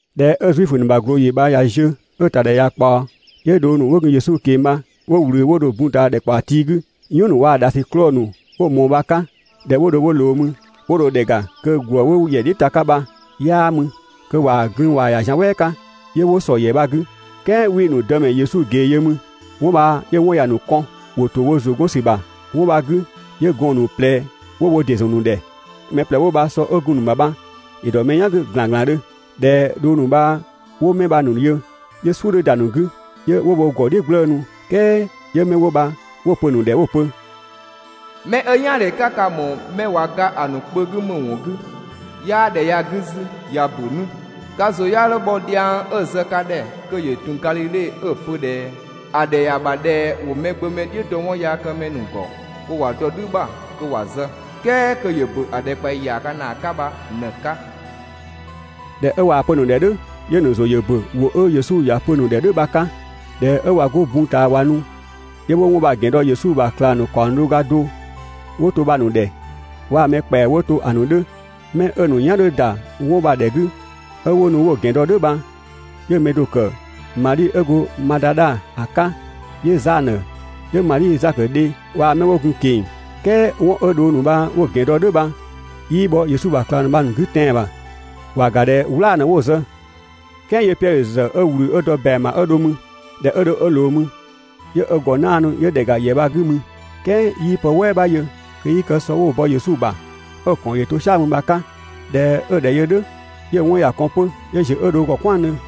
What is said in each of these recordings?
꞊Dhɛ 'ö Zuifö ‑nu ꞊glooyi bha ꞊ya ziö 'ö‑ ‑tadhɛ ꞊ya ꞊kpaɔ, 'yö dhong ‑nu 'wo gun Yesu ꞊keng‑ bha 'wo ꞊wlü 'wo dho ‑a bun ꞊taa ‑dhɛkpaɔ tii 'gü, "yɔn ‑nu waa‑ ‑dhasiklɔɔ ‑nu 'wo‑ ꞊mɔɔ bha‑ 'ka. ꞊Dhɛ 'wo dho 'wo ꞊loo mü, 'wo dho ‑dhɛ ‑ga kö ‑gwë 'wo ‑yɛ "dhiʋ̈ ‑ta 'ka bha 'yaa mü, kö ꞊waa‑ glün‑ ꞊waa‑ ‑ya zian "wɛɛ 'ka. 'Yö 'wo ‑sɔ ‑yɛ bha‑ 'gü, "kɛɛ 'wii‑ ‑nu Dëmɛ Yesu ꞊gee yö mü. 'Wɔn bha 'yö‑ 'wɔn ‑ya ‑nu kɔn, ‑wo ‑to wo ‑zʋ 'gɔn ‑sü ‑bha 'wɔn bha‑ 'gü, 'yö gɔɔn‑ ‑nu ꞊plɛ ‑wo wo ‑dɩ ‑zɔn ‑a ‑nu ‑dhɛ. Mɛ ꞊plɛ 'wo bha sɔ 'ö gun‑ ‑nu ‑bha bha ‑yö ‑dɔ mɛ "yan 'gü ‑glanglandhö. ꞊Dhɛ dhong ‑nu bha 'wo 'mɛ 'wo bha‑ ‑nu yö, 'yö "suʋ̈ 'dhö ‑da ‑nu 'gü, 'yö 'wo wo ‑gɔ "dhiʋ̈ "gblëënu. "Kɛɛ 'yö 'mɛ 'wo bha 'wo‑ pö‑ ‑nu ‑dhɛ 'wo‑ pö: «'Mɛ 'ö "yaandhe 'ka ka‑ ‑mɔɔ 'mɛ ꞊wa ga ‑a ‑nu kpö 'gü ‑më ‑wɔn 'gü? 'Yaa ‑dhɛ ya‑ 'gü 'zü, ꞊ya ‑bö 'nu, ka ‑zʋ 'ya 'dho bhɔ dhiang 'ö‑ zë ka ‑dhɛ kö ‑yö ‑tun Gadhidhe 'ö‑ pö ꞊dhɛ: «‑A ‑dhɛ ‑ya ‑bha ꞊dhɛ ‑wo Mɛgbömɛ "dhiʋ̈ dɔ 'wɔnyaakëmɛ ‑nu ‑gɔ kö ‑wa dɔ "dhü ‑bha kö ‑wa zë, "kɛɛ kö ‑yö ‑bö ‑a ‑dhɛkpaɔyi ‑yaaga ‑naa 'ka bha ꞊në‑ 'ka.» ꞊Dhɛ 'ö ꞊waa‑ pö‑ ‑nu ‑dhɛ "dhʋ̈, 'yö‑ ‑nu ‑zʋ ‑yö ‑bö ‑wʋ 'ö Yesu ‑ya pö‑ ‑nu ‑dhɛ "dhʋ̈ bha‑ 'ka. ꞊Dhɛ 'ö ꞊wa 'go bun ꞊taa ꞊wa nu, 'yö 'wo 'wɔn bha‑ ‑gɛn dɔ Yesu ‑bha ꞊klang ‑nu ‑kaɔng do ga do 'wo to bha‑ ‑nu ‑dhɛ waa‑ mɛ ‑kpɛa 'wo to‑ ‑nu 'dhö. 'Mɛ 'ö‑ ‑nu "yan 'dhö ‑da 'wɔn ‑nu bha‑ ‑dhɛ 'gü, 'ö 'wo nu 'wo‑ ‑gɛn dɔ "dhʋ̈ bha, 'yö‑ mɛ do‑ ‑kë Madhi 'ö go Madadha ‑a 'ka, 'yö Zanö, 'yö Madhi Zakö dhe waa‑ 'mɛ 'wo gun‑ ‑nu ꞊keng‑. "Kɛɛ 'wɔn 'ö dhong ‑nu bha 'wo‑ ‑gɛn dɔ "dhʋ̈ bha 'yii bhɔ Yesu ‑bha ꞊klang ‑nu bha‑ ‑nu 'gü tɛan‑ ‑bha, ‑wa ‑ga ꞊dhɛ "wlaa‑ ꞊në 'wo‑ zë. "Kɛɛ 'yö Piɛdhö ‑zë 'ö ꞊wlü 'ö dɔ ‑bɛang ‑bha 'ö dho mü. ꞊Dhɛ 'ö dho 'ö ꞊loo mü, 'yö ö ‑gɔ 'naanu 'yö ‑dhɛ ‑ga ‑yɛ 'gü mü, "kɛɛ 'yii pë "wɛɛ 'bha yö kö 'yii kë sɔ 'kö 'wo‑ bɔ Yesu ‑bha 'ö‑ ‑kɔn ‑yö to "sia‑ mü bha‑ 'ka. ꞊Dhɛ 'ö‑ ‑dhɛ yö "dhʋ̈, 'yö‑ 'wɔn ‑ya kɔn 'pö 'yö ‑ziö 'ö dho ö ‑gɔ "kwɛandhö.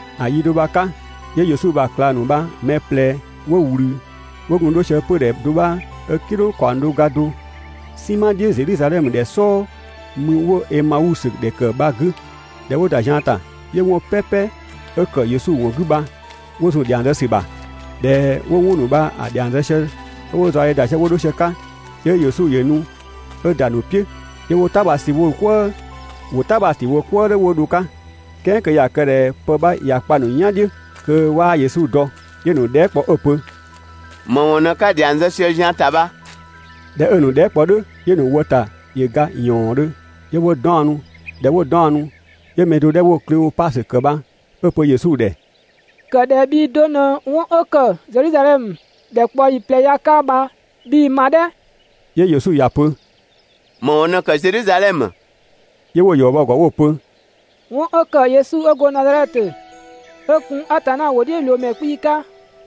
‑A yi do bha‑ 'ka, 'yö Yesu ‑bha ꞊klang ‑nu bha‑ mɛ ꞊plɛ 'wo ꞊wlü 'yö 'wo gun 'dho sië 'pödhɛ do 'bha 'ö "kidhʋng ‑kaɔng do ga do "sinma "dhiʋ̈ Zedhizadhɛmö ‑dhɛ "sɔɔ mü 'wo‑ Emausö ‑dhɛ ‑kë bha‑ 'gü. ꞊Dhɛ 'wo ‑da zian ‑ta, 'yö 'wɔn "pɛpɛ 'ö ‑kë Yesu ‑wɔn 'gü bha 'wo zun‑ ‑dhiang zë ‑sü ‑bha. ꞊Dhɛ 'wo 'wɔn ‑nu bha‑ ‑dhiang zë sië 'ö 'wo‑ zaɔdhe ‑da sië 'wo 'dho sië‑ 'ka, 'yö Yesu ‑yö nu 'ö ‑da ‑a ‑nu "piʋ̈ 'yö 'wo "ta bha sü wo "kwëë. ‑Wo "ta bha‑ ‑sü wo "kwëë "dhʋ̈ 'wo dho‑ 'ka, "kɛɛ kö ꞊ya kë ꞊dhɛ pë 'bha ꞊ya kpa mɛ "yan "dhiʋ̈, kö 'waa Yesu dɔ. 'Yö‑ ‑nu dhɛɛ" kpɔ 'ö‑ pö: «‑Më ‑wɔn ꞊në 'ka‑ ‑dhiang zë sië‑ zian ‑ta bha?» ꞊Dhɛ 'ö‑ ‑nu dhɛɛ" kpɔ "dhʋ̈, 'yö‑ ‑nu wë ‑ta ‑yö ga ‑yɔɔndhö, 'yö 'wo 'daɔnnu. ꞊Dhɛ 'wo 'daɔnnu, 'yö‑ mɛ do 'dhɛ 'wo Kleopasö ‑kë bha 'ö‑ pö Yesu ‑dhɛ: «‑Kë ꞊dhɛ bhii do ꞊në 'wɔn 'ö ‑kë Zedhizadhɛmö ‑dhɛkpaɔyi ꞊plɛ ya‑ 'ka bha 'bhii‑ ma "dhɛ!» 'Yö Yesu ‑ya pö: «‑Më ‑wɔn ꞊në ‑kë Zedhizadhɛmö?» 'Yö 'wo‑ ‑yɔ bɔ‑ ‑gɔ 'wo‑ pö: «'Wɔn 'ö kë Yesu 'ö go Nazadhɛtö, 'ö gun Atanna ‑wʋdhiʋ̈loomɛ 'kpii‑ 'ka,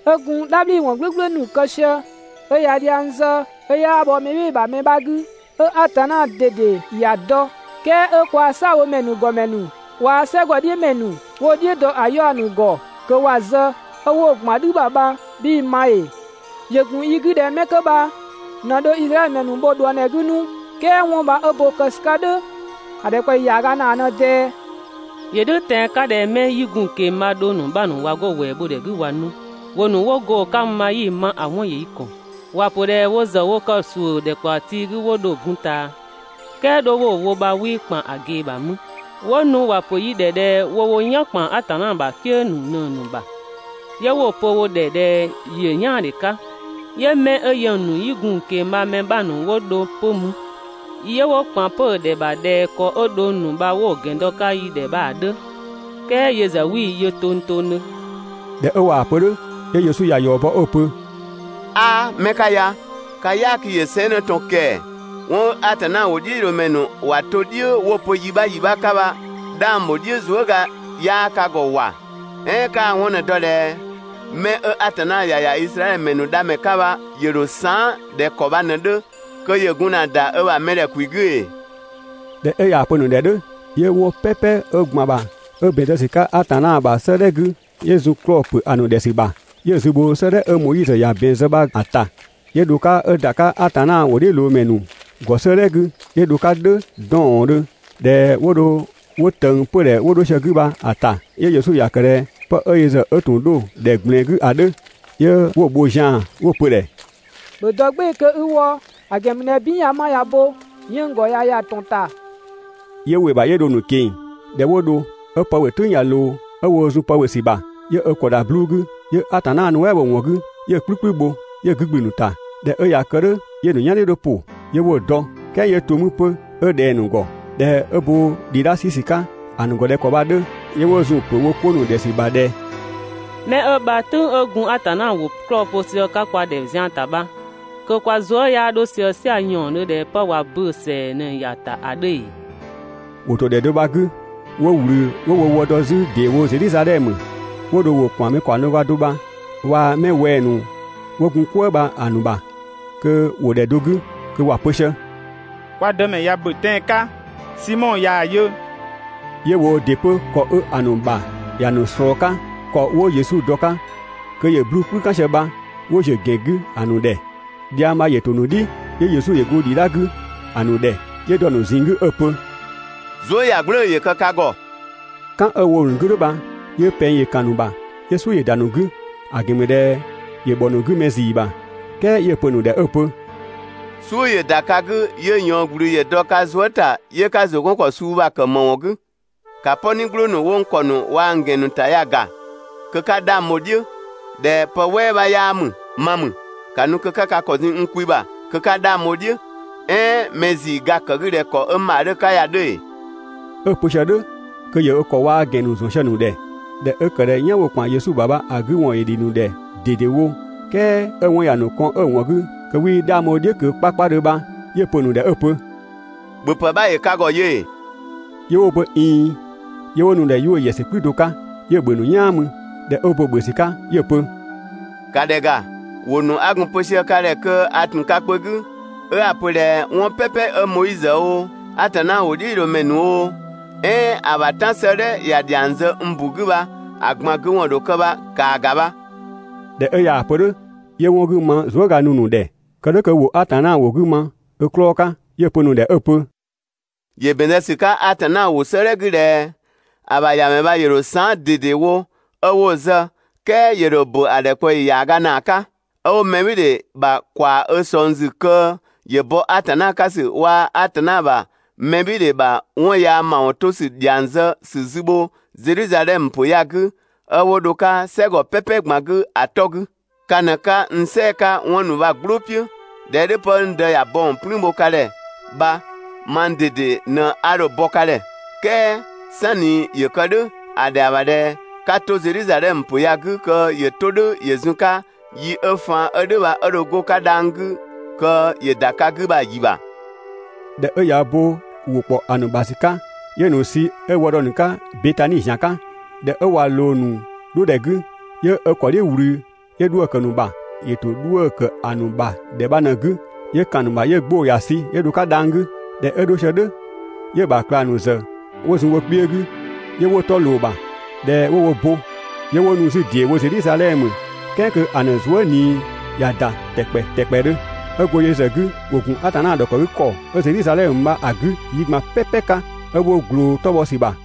'ö gun "dhabhliwɔn "gblʋ̈gblʋ̈ ‑nu kë sië, 'ö ꞊ya dhiang zë 'ö 'yaa bhɔ mɛ "bhɩɩ‑ ‑bha mɛ 'bha 'gü, 'ö Atanna ꞊dede ‑ya dɔ, "kɛɛ 'ö kwaa "saabhomɛ ‑nu ‑gɔmɛ ‑nu waa‑ "sɛgɔdhiʋ̈mɛ ‑nu 'wo‑ "dhiʋ̈ dɔ ‑a 'yaɔ‑ ‑nu ‑gɔ kö ‑wa zë, 'ö 'wo‑ ‑gban "dhü ‑bha bha 'bhii‑ ma ‑ee?» ‑Yö ‑gun yi 'gü ꞊dhɛ 'mɛ 'kö bha ꞊në dho Izraɛdhö ‑mɛ ‑nu bho ꞊dhuëngdhɛ 'gü 'nu, "kɛɛ 'wɔn bha 'ö bo kë ‑sü 'ka "dhʋ̈, ‑a ‑dhɛkpaɔyi ‑yaaga ‑naa ꞊në ꞊dɛɛ. ‑Yö "dhʋ̈ tɛan‑ 'ka ꞊dhɛ 'mɛ 'yi gun‑ ꞊keng‑ bha‑ dhong ‑nu 'bha ‑nu ꞊wa 'go‑ ‑wɛɛ bho ‑dhɛ 'gü ꞊wa nu, ‑wʋ ‑nu 'wo go‑ 'ka mü bha 'yi‑ ma, ‑a 'wɔn ‑yö yi ‑kɔn. ‑Wa ‑pö ꞊dhɛ wo ‑zë wo kë ‑suʋ̈ ‑dhɛkpaɔ tii 'gü 'wo dho‑ bun ꞊taa, "kɛɛ 'dho 'wo‑ wo bha 'wii ‑kpan ‑a ꞊gee ‑bha mü, 'wo nu ‑wa ‑pö yi ‑dhɛ ꞊dhɛ wo wo "yan ‑kpan Atanna ‑bha "kië ‑nu ꞊në‑ ‑nu ‑bha, 'yö 'wo‑ pö wo ‑dhɛ ꞊dhɛ ‑yö "yaandhe 'ka. 'Yö 'mɛ 'ö yɛng ‑nu 'yi gun‑ ꞊keng‑ bha‑ mɛ 'bha ‑nu 'wo dho 'pö mü, 'yö 'wo ‑kpan 'pö‑ ‑dhɛ ‑bha ꞊dhɛ ‑kɔ 'ö dhong ‑nu bha 'wo‑ ‑gɛn dɔ‑ 'ka yi ‑dhɛ bha‑ 'dhö, "kɛɛ yö ‑zë 'wii‑ yö tongtongdhö.» ꞊Dhɛ 'ö ꞊waa‑ pö "dhʋ̈, 'yö Yesu ‑ya ‑yɔ bɔ 'ö‑ pö: «'Aa 'mɛ 'ka ya! Ka "yaaki ‑yö 'sɛɛnnë ꞊tɔn ‑kɛɛ! 'Wɔn 'ö Atanna ‑wʋdhiʋ̈loomɛ ‑nu ‑wa to "dhʋ̈ 'wo‑ pö yi 'bha yi 'bha 'ka bha 'dhang ‑bho "dhiʋ̈ zuëga 'yaa ka ‑gɔ ‑wa! "Ɛɛn 'kaa‑ 'wɔn ꞊në‑ dɔ ꞊dhɛ 'mɛ 'ö Atanna ‑ya ‑ya Izraɛdhö ‑mɛ ‑nu Dhamɛ 'ka bha ‑yö ‑dho saan" ꞊dhɛ ‑kɔ bha ꞊në‑ 'dhö kö ‑yö gun ‑na ‑da ö ‑bha mɛdhɛ ‑kwi 'gü ‑ee? ꞊Dhɛ 'ö ꞊yaa‑ pö‑ ‑nu ‑dhɛ "dhʋ̈, 'yö 'wɔn "pɛpɛ 'ö ‑gban ‑bha 'ö ‑bɛn zë ‑sü 'ka Atanna ‑bha 'sëëdhɛ 'gü, yö ‑zun 'klɔɔ‑ ‑pö ‑nu ‑dhɛ ‑sü ‑bha, 'yö‑ zü bho 'sëëdhɛ 'ö Moizö ‑ya ‑bɛn zë bha‑ ‑ta 'yö dho‑ 'ka 'ö ‑da 'ka Atanna ‑wʋdhiʋ̈loomɛ ‑nu ‑gɔ 'sëëdhɛ 'gü, 'yö dho‑ 'ka "dhʋ̈ 'dɔɔndhö. ꞊Dhɛ 'wo dho 'wo ꞊tëng 'pödhɛ 'wo 'dho sië‑ 'gü bha‑ ‑ta, 'yö Yesu ‑ya ‑kë ꞊dhɛ 'pë 'ö yö ‑zë 'ö ‑tun 'dho‑ ‑dhɛ ꞊gblɛɛn 'gü ‑a 'dhö. 'Yö 'wo‑ bho zian‑ 'wo‑ pö‑ ‑dhɛ: «‑Bhö dɔ "gbɩɩ‑ kö i wɔ, ‑a ‑gɛn ‑mü ꞊dhɛ "bin ꞊ya 'ma ꞊ya bo, 'yënng‑ ‑gɔ ꞊ya ‑ya ‑tɔn ‑ta.» 'Yö ‑wɩ ‑bha 'yö dho‑ ‑nu ꞊keng‑. ꞊Dhɛ 'wo dho, 'ö pë ‑bhö "tʋ̈ng 'dhö ꞊loo, 'ö woo zun pë ‑bhö ‑sü ‑bha, 'yö ö ‑kɔ ‑da 'bluu‑ 'gü, 'yö Atanna nuɛ" bho‑ ‑wɔn 'gü, 'yö‑ "kplü "kplü bho 'yö‑ 'gü ‑gblü ‑a ‑nu ‑ta. ꞊Dhɛ 'ö ꞊ya kë "dhʋ̈, 'yö‑ ‑nu "yan "dhiʋ̈ ‑yö ‑pʋ, 'yö 'wo‑ dɔ, "kɛɛ 'yö to 'mü 'pö 'ö ꞊dhɛng‑ ‑nu ‑gɔ. ꞊Dhɛ 'ö bo ‑dhidha 'sü ‑sü 'ka ‑a ‑nu ‑gɔ ꞊dhɛ ‑kɔ bha‑ 'dhö, 'yö 'wo zun‑ ‑pö wo 'ko ‑nu ‑dhɛ ‑sü ‑bha ꞊dhɛ: «Mɛ 'ö bha "tʋ̈ng 'ö gun Atanna ‑wʋ 'klɔɔ‑ pö sië‑ 'ka kwa ‑dhɛ zian ‑ta bha, kö kwa zuë" 'yaa 'dho sië "sia‑ ‑yɔɔndhö ꞊dhɛ 'pë ꞊wa böö‑ ‑sɛa ꞊në‑ ‑ya ‑ta ‑a 'dhö ‑ee?» ‑Wo ‑to ‑dhɛ do bha‑ 'gü 'wo ꞊wlü 'wo wo wë dɔ 'zü ‑deewo Zedhizadhɛmö. 'Wo dho ‑wo ‑kpan mɛ ‑kaɔng do ga do bha waa‑ 'mɛ wɛng‑ ‑nu 'wo gun "kwëë bha‑ ‑nu ‑bha kö ‑wo ‑dhɛ do 'gü kö ‑wa pö sië: «Kwa Dëmɛ ꞊ya ‑bö tɛan‑ 'ka, Simɔ ꞊yaa‑ yö.» 'Yö woo ‑dɩ 'pö ‑kɔ 'ö‑ ‑nu ‑bha ‑ya ‑nu ꞊slɔɔ‑ 'ka, ‑kɔ 'wo Yesu dɔ‑ 'ka kö ‑yö 'bluu‑ "kplü "kan sië bha 'wo ‑ziö 'pö‑ ‑gɛn 'gü ‑a ‑nu ‑dhɛ. Dhiang bha ‑yö ‑to ‑nu "dhi, 'yö Yesu ‑yö go ‑dhidha 'gü ‑a ‑nu ‑dhɛ, 'yö dɔ‑ ‑nu ꞊zinng 'gü 'ö‑ pö: «Zuëyagblʋ̈ʋ̈‑ ‑yö kë ka ‑gɔ!» "Kan 'ö‑ wo‑ ‑nu 'gü "dhʋ̈ bha 'yö pɛng ‑yö ‑kan ‑a ‑nu ‑bha 'yö "suʋ̈ ‑yö ‑da ‑a ‑nu 'gü, ‑a ‑gɛn ‑mü ꞊dhɛ ‑yö ‑bhɔ ‑a ‑nu 'gü mɛ ‑zii ‑bha. "Kɛɛ 'yö‑ pö‑ ‑nu ‑dhɛ 'ö‑ pö: «"Suʋ̈ ‑yö ‑da ka 'gü 'yö ꞊yɔɔn ‑gblü ‑yö dɔ ka zuë" ‑ta 'yö 'ka ‑zʋ 'gɔn ‑kɔ suu ‑nu bha‑ ‑kë ‑më ‑wɔn 'gü? ‑Ka "pɔni "gblʋʋ ‑nu 'wo n ‑kɔ ‑nu waa‑ n ‑gɛn ‑nu ‑bha ya‑ ‑ga kö 'ka 'dhang bho‑ "dhiʋ̈ ꞊dhɛ pë "wɛɛ 'bha 'yaa ‑mü, ma ‑mü! ‑Ka nu kö 'ka ka ‑kɔ zun n kwi ‑bha kö 'ka 'dhang bho‑ "dhiʋ̈. "Ɛɛn mɛ ‑zii ga‑ ‑kë 'gü ꞊dhɛ ‑kɔ 'ö n ‑bha 'dhö‑ ‑bha ya‑ 'dhö ‑ee?» 'Ö‑ pö sië "dhʋ̈ kö ‑yö ö ‑kɔ waa‑ ö ‑gɛn ‑nu ‑zɔn sië‑ ‑nu ‑dhɛ. ꞊Dhɛ 'ö ‑kë ꞊dhɛ "yan 'wo‑ ‑kpan Yesu ‑bha bha‑ 'gü ‑wɔn ‑yö ‑dhi ‑nu ‑dhɛ ꞊dedewo, "kɛɛ 'ö‑ 'wɔn ‑ya ‑nu kɔn 'ö‑ ‑wɔn 'gü kö 'wii 'dhang bho‑ "dhiʋ̈ ꞊kö 'kpakpadhö bha, 'yö‑ pö‑ ‑nu ‑dhɛ 'ö‑ pö: «‑Bhöpë 'bha ‑yö ka ‑gɔ yö ‑ee?» 'Yö 'wo‑ pö: «꞊Iin.» 'Yö 'wo nu‑ ‑dhɛ 'yuʋ̈‑ ‑yɛsü "kplü do 'ka, 'yö‑ ‑bhö ‑a ‑nu "yaan mü. ꞊Dhɛ 'ö ö bo‑ ‑bhö ‑sü 'ka 'yö‑ pö: «‑Ka ‑dhɛ ‑ga, ‑wʋ ‑nu 'a gun‑ pö sië ka ‑dhɛ kö a ‑tun ka kpö 'gü, 'ö 'a‑ pö ꞊dhɛ 'wɔn "pɛpɛ 'ö Moizö oo, Atanna ‑wʋdhiʋ̈loomɛ ‑nu oo, "ɛɛn ‑a ‑bha "tan 'sëëdhɛ ‑ya ‑dhiang zë n ‑bu 'gü bha, ‑a ꞊gban 'gü ‑wɔn ‑dho kë bha, ‑kaa ‑ga bha.» ꞊Dhɛ 'ö ꞊yaa‑ pö "dhʋ̈, 'yö 'wɔn 'gü ma zuëga nu‑ ‑nu ‑dhɛ, kë "dhʋ̈ kö ‑wo Atanna ‑wʋ 'gü ma ö 'klɔɔ‑ 'ka. 'Yö‑ pö‑ ‑nu ‑dhɛ 'ö‑ pö: «‑Yö ‑bɛn zë ‑sü 'ka Atanna ‑wʋ 'sëëdhɛ 'gü ꞊dhɛ ‑a ‑bha ‑Yamɛ bha ‑yö ‑dho saan" ꞊dedewo 'ö 'wo‑ zë, "kɛɛ ‑yö ‑dho ‑bö ‑a ‑dhɛkpaɔyi ‑yaaga ‑naa 'ka. 'Ö 'wo mɛbhɩɩdhe ‑bha ‑kwaa ö ꞊sɔng ‑zü kö ‑yö bɔ Atanna 'ka ‑sü waa‑ Atanna ‑bha mɛbhɩɩdhe ‑bha 'wɔn yaa ‑mawɔn 'to ‑sü ‑dhiang zë ‑sü zü bho Zedhizadhɛmö ‑pö ya‑ 'gü, 'ö 'wo dho‑ 'ka "sɛgɔ "pɛpɛ ꞊gban 'gü ‑a 'tɔ 'gü. Ka ꞊në 'ka n "sɛɛ‑ 'ka 'wɔn ‑nu bha‑ "gblʋʋ "piʋ̈. ꞊Dhɛ 'ö "dhʋ̈, 'pë 'ö n Dë ‑ya bɔ ‑wɔn "plüün bho ka ‑dhɛ bha mang ꞊dede ꞊në 'a dho‑ bɔ ka ‑dhɛ. "Kɛɛ "sanni ‑yö kë "dhʋ̈ ‑a ‑dhɛa ‑bha ꞊dhɛ 'ka 'to Zedhizadhɛmö ‑pö ya‑ 'gü kö ‑yö 'to "dhʋ̈ ‑yö zun‑ 'ka yi 'ö faan 'ö "dhʋ̈ bha 'ö dho 'go‑ 'ka dhang‑ 'gü kö ‑yö ‑da ka 'gü bha‑ yi ‑bha. ꞊Dhɛ 'ö ꞊ya ö bo ‑wʋ bha‑ ‑kpɔ ‑nu ‑bha ‑sü 'ka, 'yö‑ ‑nu sü 'ö wë dɔ‑ ‑nu 'ka Betani ‑zian 'ka, ꞊dhɛ 'ö ꞊wa ꞊loo‑ ‑nu 'dho ‑dhɛ 'gü, 'yö ö ‑kɔ "dhiʋ̈ ꞊wlü 'yö 'dhuë‑ ‑kë ‑nu ‑bha. ‑Yö ‑to 'dhuë‑ ‑kë ‑nu ‑bha ‑dhɛ bha ꞊në‑ 'gü, 'yö ‑kan ‑a ‑nu ‑bha 'yö 'gbʋ‑ ‑ya sü 'yö dho‑ 'ka dhang‑ 'gü. ꞊Dhɛ 'ö 'dho sië "dhʋ̈, 'yö‑ ‑bha ꞊klang ‑nu ‑zë 'wo zun wo kpiö 'gü, 'yö 'wo 'tɔ ꞊loo‑ ‑bha. ꞊Dhɛ 'wo wo bo, 'yö 'wo nu 'zü ‑deewo Zedhizadhɛmö "kɛɛ kö ‑a ‑nu zuë" ꞊nii ꞊ya ‑da ‑tɛkpɛ ‑tɛkpɛdhö. 'Ö go yö ‑zë 'gü, ‑wo ‑gun Atanna ‑dhɔkëgükɔ 'ö Zedhizadhɛmö bha‑ 'gü yi ꞊gban "pɛpɛ 'ka 'ö 'wo ꞊gloo‑ 'tɔ bhɔ ‑sü ‑bha.